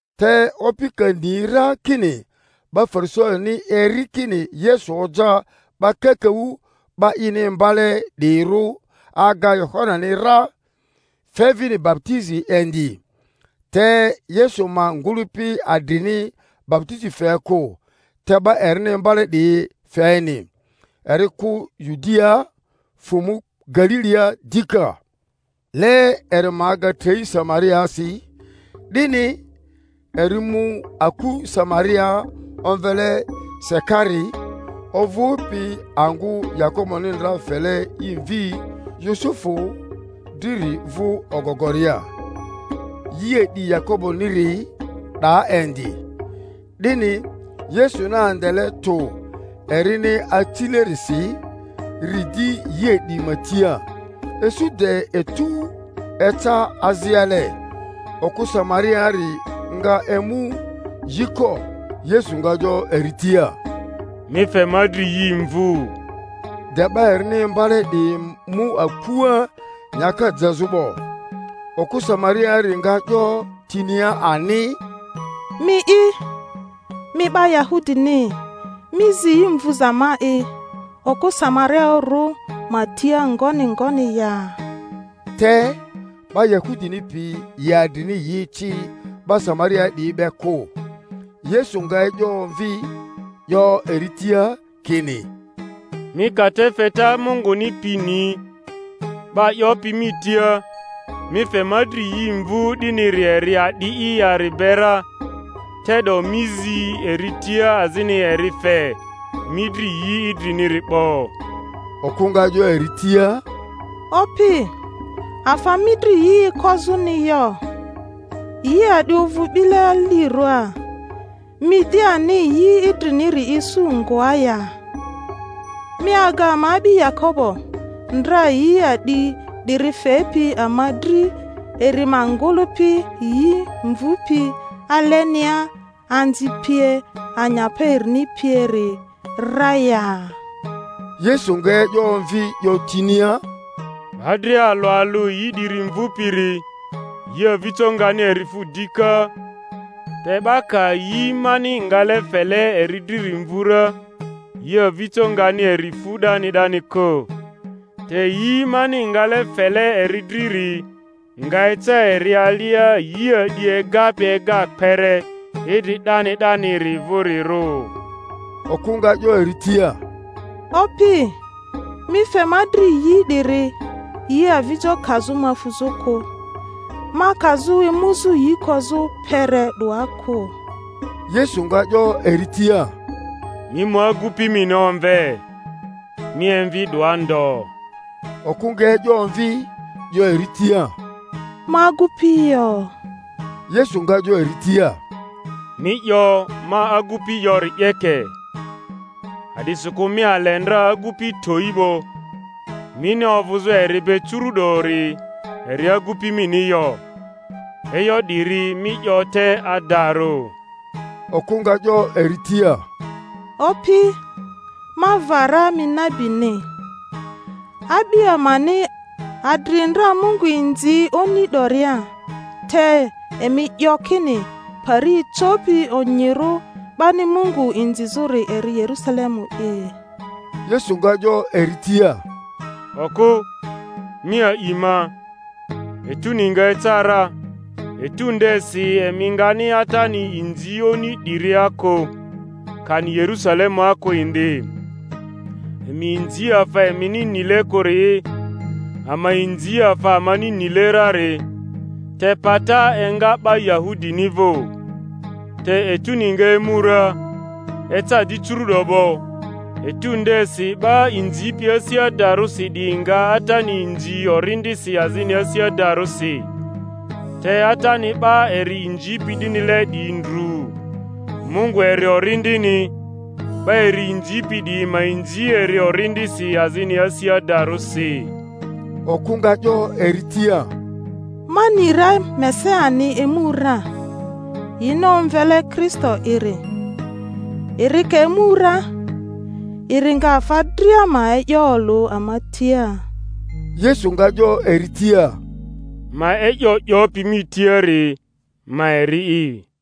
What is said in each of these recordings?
Te Opi ka ni ra kini 'ba Farisaini eri kini Yesu oja 'ba kakaᴜ 'ba ini imbale 'diyirᴜ aga Yohanani ra, fe vini baputizi indi (te Yesu ma ngᴜlᴜpi adrini baputizi fe kᴜ, te 'ba erini imbale 'diyi feni), eri kᴜ Yudia, fᴜ mu Galilia dika. Le eri ma aga trei Samariaasi. 'Dini eri mu aku Samariaa omvele Sikari, ovᴜpi angᴜ Yakoboni ndra fele i mvi Yusufu driri vᴜ ogogoria. Yi a'di Yakoboniri 'daa indi; 'dini Yesuni andele tᴜ erini acilerisi, ri di yi a'di ma tia. Isu de etu eca aziale. Okᴜ Samariaari nga emu yi ko. Yesu nga 'yo eri tia, Mi fe ma dri yi mvᴜ. De 'ba erini imbale 'diyi mu akua nyaka jezᴜ 'bo. Okᴜ Samariaari nga 'yo tinia ani, Mi'i, mi 'ba Yahudini, mi zi yi mvᴜza ma'i okᴜ Samarioᴜrᴜ ma tia ngoni ngoni ya? Te 'ba Yahudini piyi yi adrini yi eci 'ba Samariaa 'diyi be kᴜ. Yesu nga e'yo omvi, 'yo eri tia kini, Mi ka te feta Munguni pi ni, 'ba 'yopi mi tia, Mi fe ma dri yi mvᴜ 'diniri eri a'di'i yari be ra, te'do mi zi eri tia azini eri fe mi dri yi idriniri 'bo. Okᴜ nga 'yo eri tia, Opi, afa mi dri yi ekozᴜni yo, yi a'di ovᴜ 'bile alirᴜa; mi di ani yi idriniri isu ngoa ya? Mi aga ama a'bi Yakobo, ndra yi a'di 'diri fepi ama dri, eri ma ngᴜlᴜpi yi mvupi alenia, anzi pie, anyapa erini pieri ra ya? Yesu nga e'yo omvi 'yo tinia, Ba dria alᴜ alᴜ yi 'diri mvupiri, yi avijoni nga eri fu dika, te 'ba ka yi mani ngale fele eri driri mvu ra, yi avijo ngani eri fu 'dani 'dani kᴜ; te yi mani ngale fele eri driri nga eca eri alia yi a'di egapi ega kpere idri 'dani 'daniri vᴜrirᴜ. Okᴜ nga 'yo eri tia, Opi, mi fe ma dri yi 'diri, yi avijo kazᴜ ma fuzᴜ kᴜ, ma kazᴜ emuzᴜ yi kozᴜ kpere 'doa kᴜ. Yesu nga 'yo eri tia, Mi mu agupi mini omve, mi emvi 'doa ndo. Okᴜ nga e'yo omvi, 'yo eri tia, Ma agᴜpi yo. Yesu nga 'yo eri tia, Mi 'yo, Ma agupi yori 'yeke; a'disikᴜ mi ale ndra agᴜpi towi 'bo, mini ovᴜzᴜ eri be curᴜ'dori eri agupi mini yo; e'yo 'diri mi 'yo te adarᴜ. Okᴜ nga 'yo eri tia, Opi, ma va ra mi nabini. A'bi amani adri ndra Mungu inzi oni 'doria; te emi 'yo kini pari ecopi onyirᴜ 'bani Mungu inzizᴜri eri Yerᴜsalemu'i. Yesu nga 'yo eri tia, Okᴜ, mi a'i ma, etuni nga eca ra, etu ndesi emi ngani Atani inzi oni 'diria kᴜ, kani Yerusalemua kᴜ indi. Emi inzi afa emini nile kᴜri'i; ama inzi afa amani nile rari, te pata enga 'ba Yahudini vᴜ. Te etuni nga emu ra, eca di curu'do 'bo, etu ndesi 'ba inzipi asi adarᴜsi 'diyi nga Atani inzi orindisi azini asi adarᴜsi; te Atani 'ba eri inzipi 'dinile 'diyi ndru. Mungu eri Orindini; 'ba eri inzipi 'diyi ma inzi eri orindisi azini asi adarᴜsi. Okᴜ nga 'yo eri tia, Ma ni ra Mesiani emu ra (yini omvele Kristo'iri); eri ka emu ra, eri nga afa dria ma e'yo olᴜ ama tia. Yesu nga 'yo eri tia, Ma e'yo 'yopi mi tiari, ma eri'i.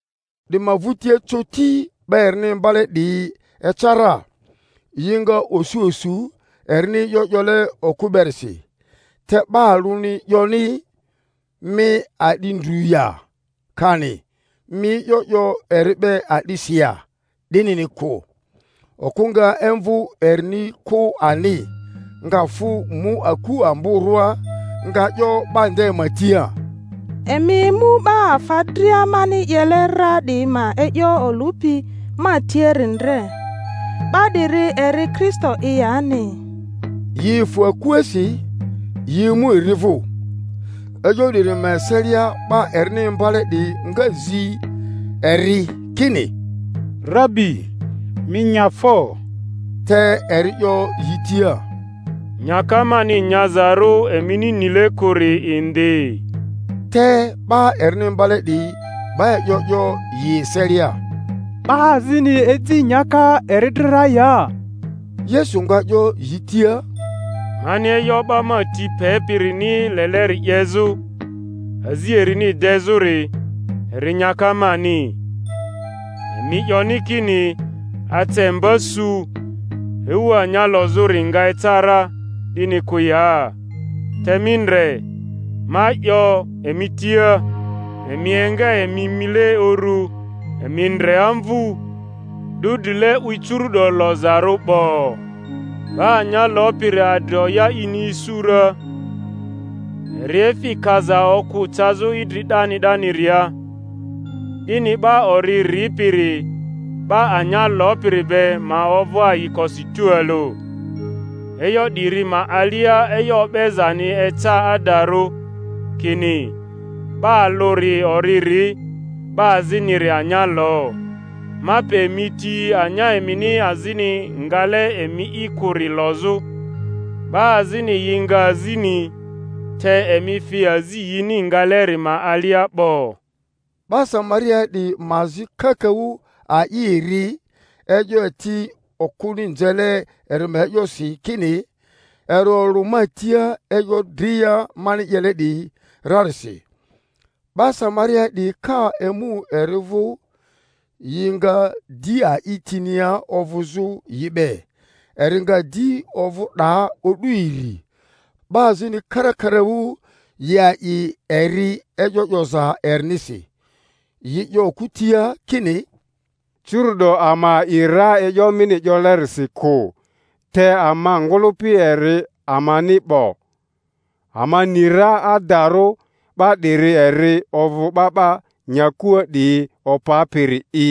'Di ma vᴜtia coti 'ba erini imbale 'diyi eca ra. Yi nga osu osu erini e'yo 'yole okᴜ berisi, te 'ba alᴜni 'yoni, Mi a'di ndru ya? kani, Mi e'yo 'yo eri be a'disi ya? 'dinini kᴜ. Okᴜ nga imvᴜ erini kᴜ ani, nga fᴜ mu aku amborᴜa, nga 'yo 'ba nde ma tia, Emi emu 'ba afa dria mani 'yele ra 'diyi ma e'yo olᴜpi ma tiari ndre. 'Ba 'diri eri Kristo'i yani? Yi efᴜ akuasi, yi emu eri vᴜ. E'yo 'diri ma eselia 'ba erini imbale 'diyi nga zi eri kini, Rabi, mi nya fo. Te eri 'yo yi tia, Nyaka mani nyazarᴜ emini nile kᴜri indi. Te 'ba erini imbale 'diyi 'ba e'yo 'yo yi eselia, 'Ba azini eji nyaka eri dri ra ya? Yesu nga 'yo yi tia, Mani e'yo 'ba ma ti pepirini leleri 'yezᴜ, azi erini dezᴜri, eri nyaka mani. Emi 'yoni kini, Ace mba su, ewu anya lozᴜri nga eca ra, 'dini kᴜ ya? Te mi ndre, ma 'yo emi tia, Emi enga emi mile uru, emi ndre amvᴜ, 'dᴜ drile 'wi curu'do lozarᴜ 'bo. 'Ba anya lopiri adri oya ini isu ra, eri efi kaza okᴜ cazᴜ idri 'dani 'daniria, 'dini 'ba ori ripiri 'ba anya lopiri be ma ovᴜ ayikosi tualᴜ. E'yo 'diri ma alia e'yo o'bezani eca adarᴜ, kini, 'Ba alᴜri ori ri, 'ba aziniri anya lo. Ma pe emi ti anya emini azini ngale emi'i kᴜri lozᴜ; 'ba azini yi nga azini, te emi fi azi yini ngaleri ma alia 'bo. 'Ba Samariaa 'diyi ma azi kakaᴜ a'i eri e'yo eti okᴜni nzele eri ma e'yosi kini, Eri olᴜ ma tia e'yo dria mani 'yele 'diyi rarisi. 'Ba Samariaa 'diyi ka emu eri vᴜ, yi nga di a'i tinia ovᴜzᴜ yi be; eri nga di ovᴜ 'daa o'du iri. 'Ba azini karakaraᴜ yi a'i eri e'yo 'yoza erinisi. Yi 'yo okᴜ tia kini, Curu'do ama a'i ra e'yo mini 'yolerisi kᴜ, te ama ngᴜlᴜpi eri amani 'bo, ama ni ra adarᴜ 'ba 'diri eri ovᴜ 'Ba 'ba nyakua 'diyi Opapiri'i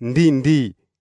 ndi ndi.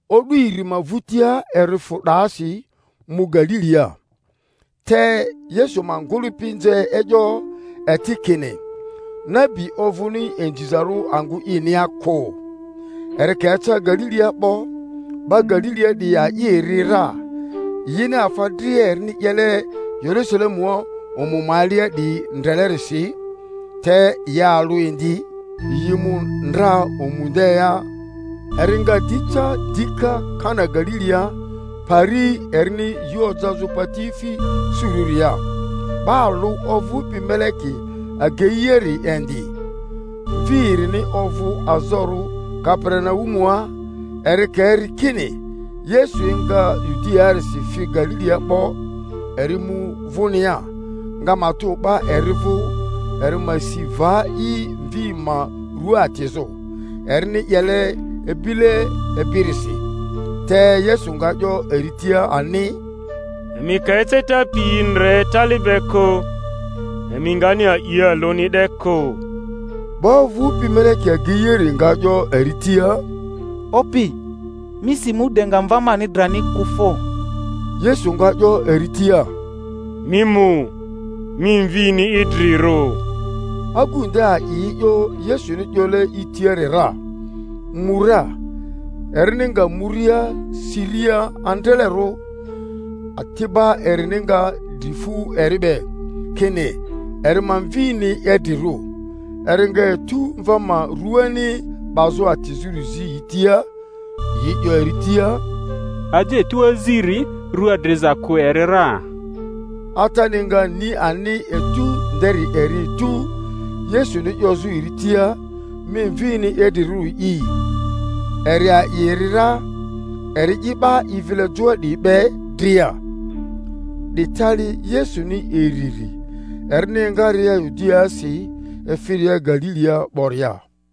O'du iri ma vᴜtia eri fᴜ 'daasi mu Galilia. Te Yesu ma ugᴜlᴜpi nze e'yo eti kini, nabi ovᴜni inzizarᴜ angᴜ inia kᴜ. Eri ka eca Galilia 'bo, 'ba Galilia 'diyi a'i eri ra, yini afa dria erini 'yele Yerusalemua omu ma alia 'diyi ndrelerisi; te yi alᴜ indi, yi mu ndra omu ndea. Eri nga di ca dika Kana Galilia pari erini yi ojazᴜ patiefi surᴜria. 'Ba alᴜ ovᴜpi meleki ageiari indi, mvi erini ovᴜ azorᴜ Kaperinaumua. Eri ka eri kini Yesu enga Yudiaarisi fi Galilia 'bo, eri mu vᴜnia, nga matᴜ 'ba eri vᴜ eri ma si va i mvi ma rua atizᴜ, erini 'yele ebile ebirisi. Te Yesu nga 'yo eri tia ani, Emi ka eceta piyi ndre tali be kᴜ, emi ngani a'i alᴜni 'de kᴜ. 'Ba ovᴜpi meleki ageiari nga 'yo eri tia, Opi, mi si mu de nga mva mani drani kᴜ fo! Yesu nga 'yo eri tia, Mi mu; mi mvini idrirᴜ. Agu nde a'i e'yo Yesuni 'yole i tiari ra, mu ra. Erini nga muria siria andralero, ati'ba erini nga dri fu eri be, kini eri ma mvini idrirᴜ. Eri nga etu mva ma ruani 'bazᴜ atizᴜri zi yi tia. Yi 'yo eri tia, Aje etu aziri rua driza kᴜ eri ra. Atani nga ni ani etu nderi eri etu Yesuni 'yozᴜ eri tia, Mi mvini idrirᴜri'i; eri a'i eri ra, eri'i 'ba i vile joa 'diyi be dria. 'Di tali Yesuni iriri, erini engaria Yudiaasi efiria Galilia 'boria.